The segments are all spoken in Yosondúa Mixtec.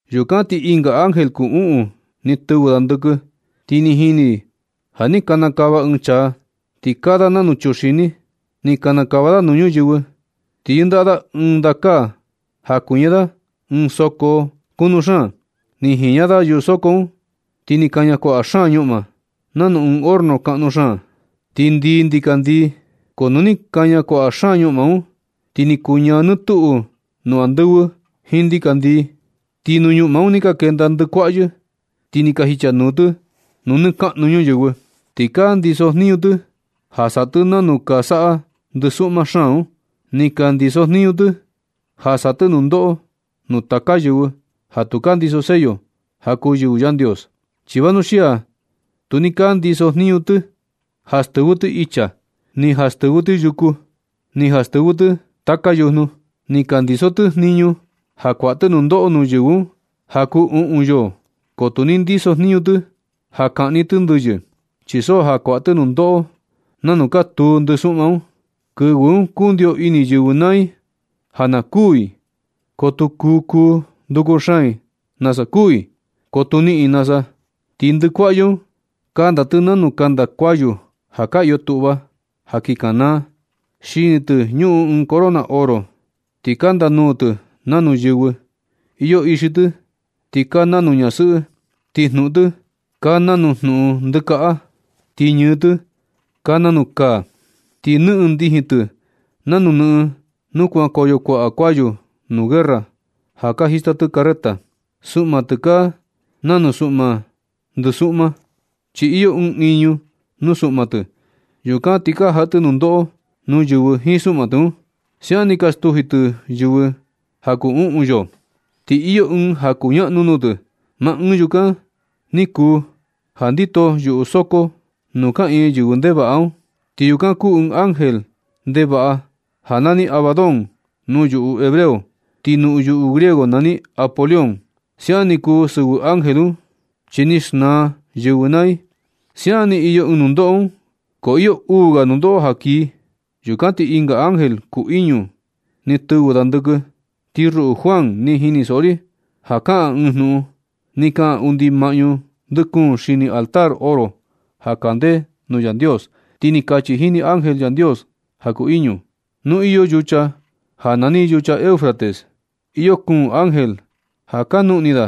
Yukan ti ɨnga ángel kuu uꞌun ni tɨvɨ da ndɨkɨ. Ti ni jini ri ja ni kanakava ɨɨn chaa, ti kaa da nanu chuxini. Ni kanakava da nuu ñuyɨvɨ, ti yɨndaꞌa da ɨɨn ndakaa ja kuiña da ɨɨn soko kunu xaan. Ni jiña da yuꞌu soko un, ti ni kaña kuaꞌa xaan ñuꞌma, nanu ɨɨn horno kaꞌnu xaan. Ti ndii ndikandii. Ko nu ni kaña kuaꞌa xaan ñuꞌma un, ti ni kuñaa nɨ tuꞌu nuu andɨvɨ jiin ndikandii. Ti nuu ñuꞌma un ni ka kenda ndɨkuaꞌyɨ, ti ni ka jichanuu tɨ nuu nɨ kaꞌnu ñuyɨvɨ. Ti ka ndisojniñu tɨ ja saꞌa tɨ nanu ka saꞌa ndɨsuꞌma xaan un. Ni ka ndisojniñu tɨ ja saꞌa tɨ nundoꞌo nuu taka yɨvɨ, ja tu ka ndiso sello ja kuu yɨvɨ Yandios. Chi vanuxia tu ni ka ndiso tɨ jniñu ja stɨvɨ tɨ icha, ni ja stɨvɨ tɨ yuku, ni ja stɨvɨ tɨ taka yujnu. Ni ka ndiso tɨ jniñu ja kuaꞌa tɨ nundoꞌo nuu yɨvɨ un ja kuu uꞌun yoo, ko tu ni ndisojniñu tɨ ja kaꞌni tɨ ndɨyɨ. Chi so ja kuaꞌa tɨ nundoꞌo nanu ka tuu ndɨsuꞌma un. Kɨvɨ un kundio ini yɨvɨ naa i ja na kuū i, ko tu kuu kuu nduku xaan i nasa a kuū i, ko tu niꞌin i nasa. Ti ndɨkuaꞌyɨ un, kanda tɨ nanu kanda kayu ja ka iyo tuꞌva ja kin kanaa. Xini tɨ ñuꞌun ɨɨn corona oro. Ti kanda nuu tɨ nanu yɨvɨ. Iyo ixi tɨ ti kaa nanu ñasɨꞌɨ. Ti jnuꞌun tɨ kaa nanuꞌun ndɨkaꞌa. Ti ñɨɨ tɨ kaa nanua kaa. Ti nɨꞌɨn ndijin tɨ nanu nɨꞌɨn nuu kuankoyo kuaꞌa kayu nuu guerra ja ka jista tɨ carreta. Suꞌma tɨ kaa na nuna suꞌma ndɨsuꞌma, chi iyo ɨɨn iñu nuu suꞌma tɨ. Yukan ni ka jaꞌa tɨ nundoꞌo nuu yɨvɨ jiin suꞌma tɨ un. Siaꞌan ni ka stuji tɨ yɨvɨ ja kuu uꞌun yoo. Ti iyo ɨɨn ja kuñaꞌnu nuu tɨ. Maa ɨɨn yukan ni kuu ja ndito yuꞌu soko nuu kaꞌiin yɨvɨ ndevaꞌa un. Ti yukan kuu ɨɨn ángel ndevaꞌa ja nani Abadón nuu yuꞌu hebreo, ti nuu yuꞌu griego nani Apolión. Siaꞌan ni kuu sɨvɨ ángel un, chi ni xnaa yɨvɨ naa i. Siaꞌan ni iyo ɨɨn nundoꞌo un, ko iyo uu ga nundoꞌo ja kii. Yukan ti ɨnga ángel kuu iñu ni tɨvɨ da ndɨkɨ. Ti ruꞌu Juan, ni jinisoꞌo ri ja kaꞌan ɨɨn jnuꞌun. Ni kaꞌan undi maꞌñu ndɨ kuun xini altar oro ja kande nuu Yandios. Ti ni kachi jini ángel Yandios ja kuu iñu: ―Nu iyo yucha ja nani yucha Eufrates, iyo kuun ángel ja ka nuꞌni da.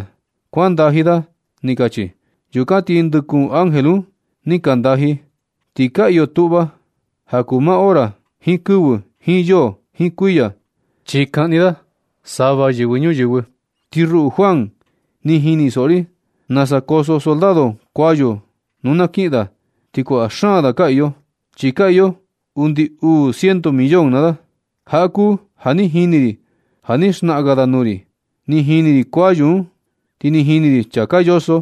Kuan ndaji da ―ni kachi. Yukan ti ndɨ kuun ángel un ni ka ndaji. Ti ka iyo tuꞌva ja kuu maa hora, jiin kɨvɨ, jiin yoo, jiin kuiya, chi kaꞌni da sava yɨvɨ ñuyɨvɨ. Ti ruꞌu Juan, ni jinisoꞌo ri nasa koso soldado kuayu nu na kiꞌin da. Ti kuaꞌa xaan da ka iyo, chi ka iyo undi uu ciento millón da naa da. Jaꞌa kuu ja ni jini ri na ni xnaꞌan ga da nuu ri. Ni jini ri kuayu un, ti ni jini ri chaa ka yoso.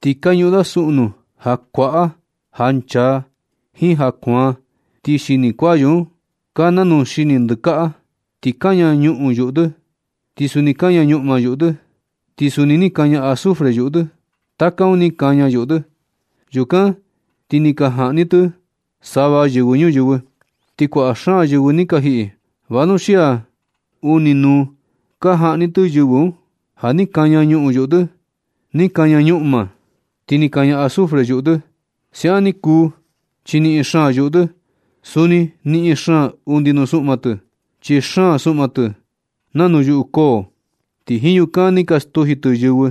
Ti ka ñuꞌun da suꞌu nuu ja kuaꞌa, ja nchaa, jiin ja kuaan. Ti xini kayu un ka nanuu xini ndɨkaꞌa. Ti kaña ñuꞌun yuꞌu tɨ. Ti suni kaña ñuꞌma yuꞌu tɨ. Ti suni ni kaña azufre yuꞌu tɨ. Taka un ni kaña yuꞌu tɨ. Yukan ti ni ka jaꞌni tɨ sava yɨvɨ ñuyɨvɨ. Ti kuaꞌa xaan yɨvɨ ni ka jiꞌi vanuxia uni nuu ka jaꞌni tɨ yɨvɨ un, ja ni kaña ñuꞌun yuꞌu tɨ, ni kaña ñuꞌa, ti ni kaña azufre yuꞌu tɨ. Siaꞌan ni kuu chi niꞌin xaan yuꞌu tɨ. Suni niꞌin xaan undi nuu suꞌma tɨ, chi xaan suꞌma tɨ un nanu yuꞌu koo, ti jiin yukan ni ka stuji tɨ yɨvɨ.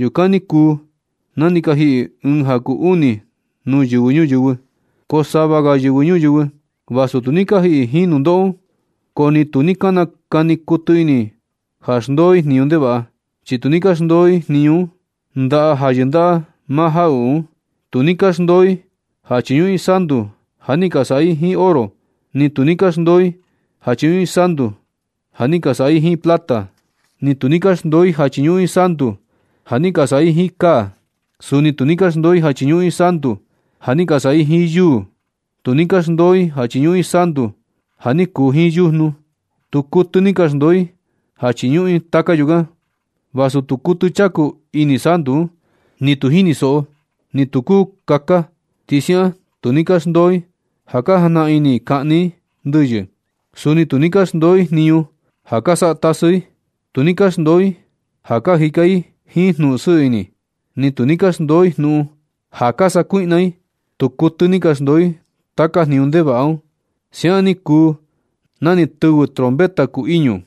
Yukan ni kuu na ni ka jiꞌi ɨɨn ja kuu uni nuu yɨvɨ ñuyɨvɨ. Ko sava ga yɨvɨ ñuyɨvɨ, vasu tu ni ka jiꞌi i jiin nundoꞌo un. Ko ni tu ni ka nakani kuɨtɨ ini i ja xndoo i jniñu ndevaꞌa. Chi tu ni ka xndoo i ja chiñuꞌun i ndajaꞌa ja yɨndaꞌa maa jaꞌuꞌu un. Tu ni ka xndoo i ja chiñuꞌun i santu ja ni ka saꞌa i jiin oro. Ni tu ni ka xndoo i ja chiñuꞌun i santu ja ni ka saꞌa i jiin plata. Ni tu ni ka xndoo i ja chiñuꞌun i santu ja ni ka saꞌa i jiin kaa. Suni tu ni ka xndoo i ja chiñuꞌun i santu ja ni ka saꞌa i jiin yuu. Ni tu ni ka xndoo i ja chiñuꞌun i santu ja ni kuu jiin yujnu. Tu kuɨtɨ ni ka xndoo i ja chiñuꞌun i taka yukan, vasu tu kuɨtɨ chaku ini santu un, ni tu jinisoꞌo, ti ni nu tu kuu kaka. Suni siaꞌan tu ni ka xndoo i ja ka jajnaꞌan ini i kaꞌni i ndɨyɨ. Suni tu ni ka xndoo i jniñu ja ka saꞌa tasɨ i. Tu ni ka xndoo i ja ka jika i jiin jnuꞌun sɨɨ ini. Ni tu ni ka xndoo i jnuꞌun ja ka sakuiꞌna i. Tu kuɨtɨ ni ka xndoo i taka jniñu ndevaꞌa un. Siaꞌan ni kuu na ni tɨvɨ trompeta kuu iñu.